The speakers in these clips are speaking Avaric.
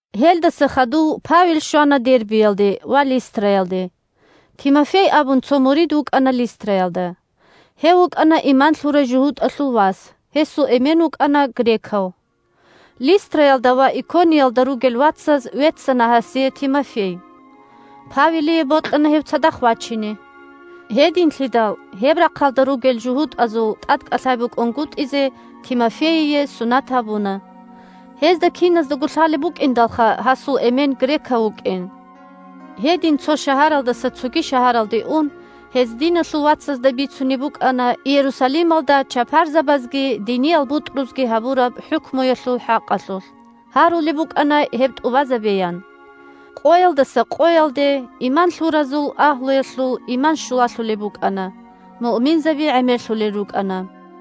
Гьелдаса хадув Павел щвана Дербиялде ва Листраялде. Тимофей абун цо мурид вукӀана Листраялда. Гьев вукӀана иман лъурай жугьутӀалъул вас, гьесул эмен вукӀана грекав. Листраялда ва Икониялда ругел вацаз веццана гьасие Тимофей. Павелие бокьана гьев цадахъ вачине. Гьединлъидал гьеб рахъалда ругел жугьутӀазул тӀадкӀалъай букӀунгутӀизе Тимофейие сунат гьабуна. Гьезда киназдаго лъалеб букӀиндалха гьасул эмен грекав вукӀин. Гьедин цо шагьаралдаса цоги шагьаралде ун, гьез диналъул вацазда бицунеб букӀана Иерусалималда чапарзабазги диниял бутӀрузги гьабураб хӀукмуялъул хӀакъалъулъ. Гьарулеб букӀана гьеб тӀубазабеян. Къоялдаса къоялде иман лъуразул агьлуялъул иман щулалъулеб букӀана, муъминзаби гӀемерлъулел рукӀана.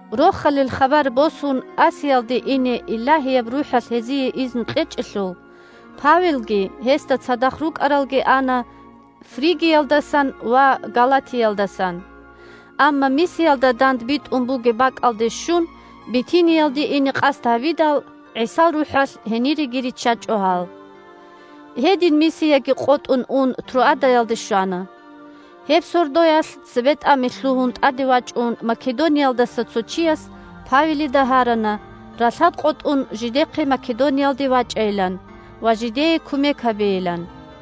Рохалил хабар босун Асиялде ине Илагьияб РухӀалъ гьезие изну кьечӀелъул, Павелги гьесда цадахъ рукӀаралги ана Фригиялдасан ва Галатиялдасан. Амма Мисиялда дандбитӀун бугеб бакӀалде щун Битиниялде ине къасд гьабидал, ГӀисал РухӀалъ гьениреги риччачӀо гьал. Гьедин Мисияги къотӀун ун Троадаялде щвана. Гьеб сордоялъ цебетӀами лъугьун тӀаде вачӀун Македониялдаса цо чияс Павелида гьарана ралъад къотӀун жидехъе Македониялде вачӀайилан ва жидее кумек гьабейилан.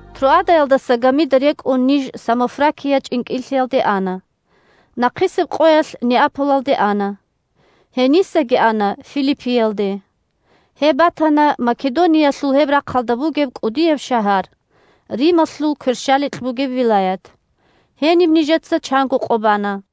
Троадаялдаса гамида рекӀун ниж Самофракия чӀинкӀиллъиялде ана. Нахъисеб къоялъ Неаполалде ана. Гьенисаги ана Филиппиялде. Гьеб батана Македониялъул гьеб рахъалда бугеб кӀудияб шагьар, Рималъул кверщаликь бугеб вилаят. Гьениб нижеца чанго къо бана.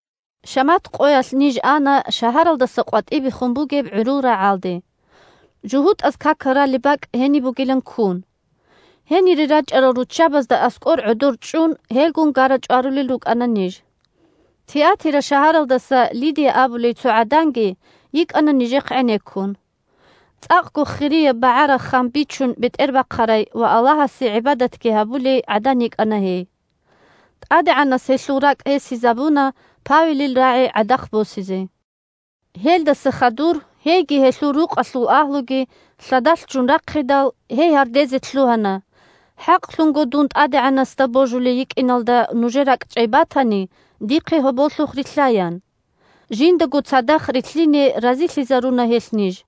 Шамат къоялъ ниж ана шагьаралдаса къватӀибехун бугеб гӀурул рагӀалде, жугьутӀаз какал ралеб бакӀ гьениб бугилан ккун. Гьенире рачӀарал руччабазда аскӀор гӀодор чӀун, гьелгун гара-чӀварулел рукӀана ниж. Тиатира шагьаралдаса Лидия абулей цо гӀаданги йикӀана нижехъ гӀенеккун. ЦӀакъго хирияб багӀараб ххам бичун бетӀербахъарай ва Аллагьасе гӀибадатги гьабулей гӀадан йикӀана гьей. ТӀадегӀанас гьелъул ракӀ гьесизабуна Павелил рагӀи гӀадахъ босизе. Гьелдаса хадур гьейги гьелъул рукъалъул агьлуги лъадалъ ччун рахъидал, гьей гьардезе лъугьана: – ХӀакълъунго дун ТӀадегӀанасда божулей йикӀиналда нужер ракӀчӀей батани, дихъе гьоболлъухъ рилълъа, – ян. Жиндаго цадахъ рилълъине разилъизаруна гьелъ ниж.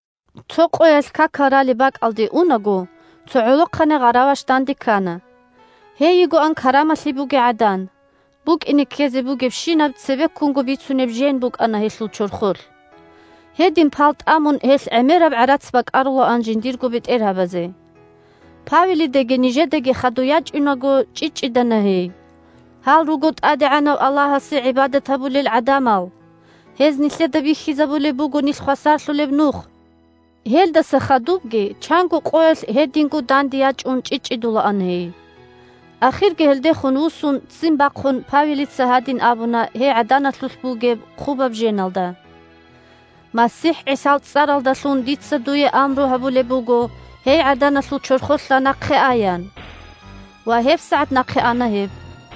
Цо къоялъ какал ралеб бакӀалде унаго, цо гӀолохъанай гъараваш данде ккана. Гьей йигоан карамалъи бугей гӀадан, букӀине-ккезе бугебщинаб цебеккунго бицунеб жен букӀана гьелъул чорхолъ. Гьедин пал тӀамун гьелъ гӀемераб гӀарац бакӀарулаан жиндирго бетӀергьабазе. Павелидаги нижедаги хадуй ячӀунаго, чӀчӀичӀчӀидана гьей: – Гьал руго ТӀадегӀанав Аллагьасе гӀибадат гьабулел гӀадамал. Гьез нилъеда бихьизабулеб буго нилъ хвасарлъулеб нух! Гьелдаса хадубги чанго къоялъ гьединго данде ячӀун чӀчӀичӀчӀидулаан гьей. Ахирги гьелдехун вуссун ццин бахъун, Павелица гьадин абуна гьей гӀаданалъулъ бугеб хъубаб женалда: – МасихӀ ГӀисал цӀаралдалъун дица дуе амру гьабулеб буго гьей гӀаданалъул чорхолъа нахъе аян! Ва гьебсагӀат нахъе ана гьеб.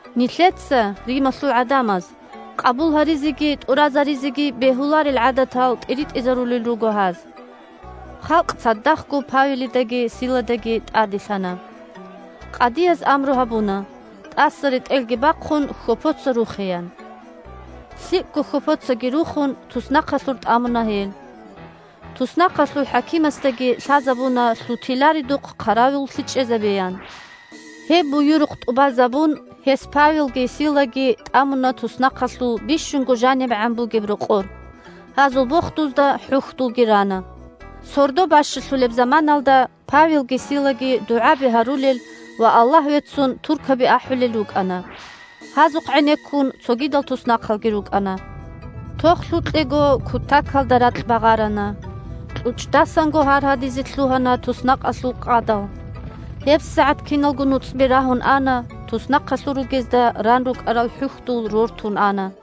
Нилъеца – Рималъул гӀадамаз – къабул гьаризеги тӀуразаризеги бегьуларел гӀадатал тӀиритӀизарулел руго гьаз. Халкъ цадахъго Павелидаги Силадаги тӀаделъана. Къадияз амру гьабуна, тӀаса ретӀелги бахъун, хьопоца рухеян. ЛъикӀго хьопоцаги рухун, туснахъалъур тӀамуна гьел. Туснахъалъул хӀакимасдаги лъазабуна лъутиларедухъ хъаравуллъи чӀезабеян. Гьеб буюрухъ тӀубазабун, гьес Павелги Силаги тӀамуна туснахъалъул бищунго жанибегӀан бугеб рокъор, гьазул бохдузда хӀухьдулги рана. Сордо бащалъулеб заманаялда Павелги Силаги дугӀаби гьарулел ва Аллагь веццун туркаби ахӀулел рукӀана. Гьазухъ гӀенеккун цогидал туснахъалги рукӀана. Тохлъукьего кутакалда ракь багъарана. КьучӀдасанго гьаргьадизе лъугьана туснахъалъул къадал. ГьебсагӀат киналго нуцӀби рагьун ана, туснахъалъур ругезда ран рукӀарал хӀухьдул рортун ана.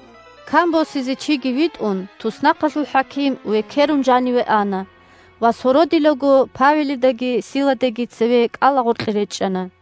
Кан босизе чиги витӀун, туснахъалъул хӀаким векерун жаниве ана ва сородилаго Павелидаги Силадаги цеве кӀалагъоркье речӀчӀана.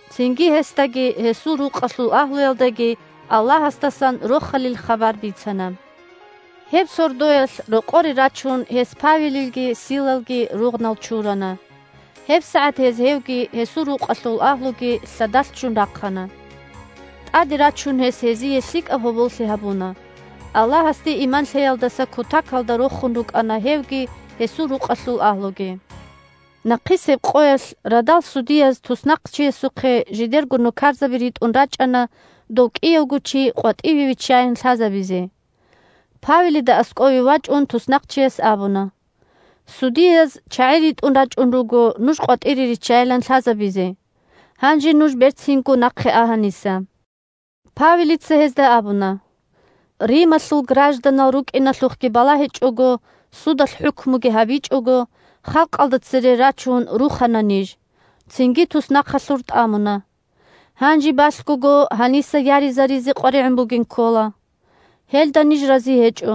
Цинги гьесдаги гьесул рукъалъул агьлуялдаги Аллагьасдасан Рохалил хабар бицана. Гьеб сордоялъ рокъоре рачун гьес Павелилги Силалги ругънал чурана. ГьебсагӀат гьез гьевги гьесул рукъалъул агьлуги лъадалъ ччун рахъана. ТӀаде рачун гьес гьезие лъикӀаб гьоболлъи гьабуна, Аллагьасде иман лъеялдаса кутакалда рохун рукӀана гьевги гьесул рукъалъул агьлуги. Нахъисеб къоялъ радал судияз туснахъчиясухъе жидерго нукарзаби ритӀун рачӀана дов кӀиявго чи къватӀиве виччаян лъазабизе. Павелида аскӀове вачӀун туснахъчияс абуна: – Судияз чагӀи ритӀун рачӀун руго нуж къватӀире риччайилан лъазабизе. Гьанже нуж берцинго нахъе а гьаниса. Павелица гьезда абуна: – Рималъул гражданал рукӀиналъухъги балагьичӀого, судалъ хӀукмуги гьабичӀого, халкъалда цере рачун рухана ниж, цинги туснахъалъур тӀамуна. Гьанже балъгого гьаниса яризаризе къваригӀун бугин ккола. Гьелда ниж рази гьечӀо.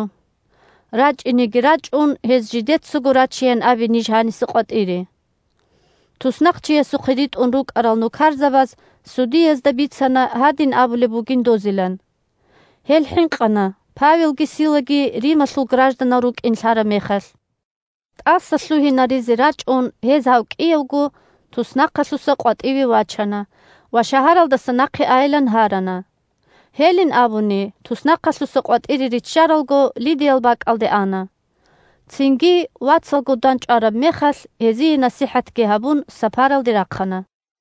РачӀинеги рачӀун гьез жидецаго рачеян абе ниж гьаниса къватӀире! Туснахъчиясухъе ритӀун рукӀарал нукарзабаз судиязда бицана гьадин абулеб бугин дозилан. Гьел хӀинкъана Павелги Силаги Рималъул гражданал рукӀин лъараб мехалъ. ТӀасалъугьинаризе рачӀун, гьез гьав кӀиявго туснахъалъуса къватӀиве вачана ва шагьаралдаса нахъе айилан гьарана. Гьелин абуни, туснахъалъуса къватӀире риччаралго, Лидиял бакӀалде ана. Цинги, вацалгун дандчӀвараб мехалъ, гьезие насихӀатги гьабун, сапаралде рахъана.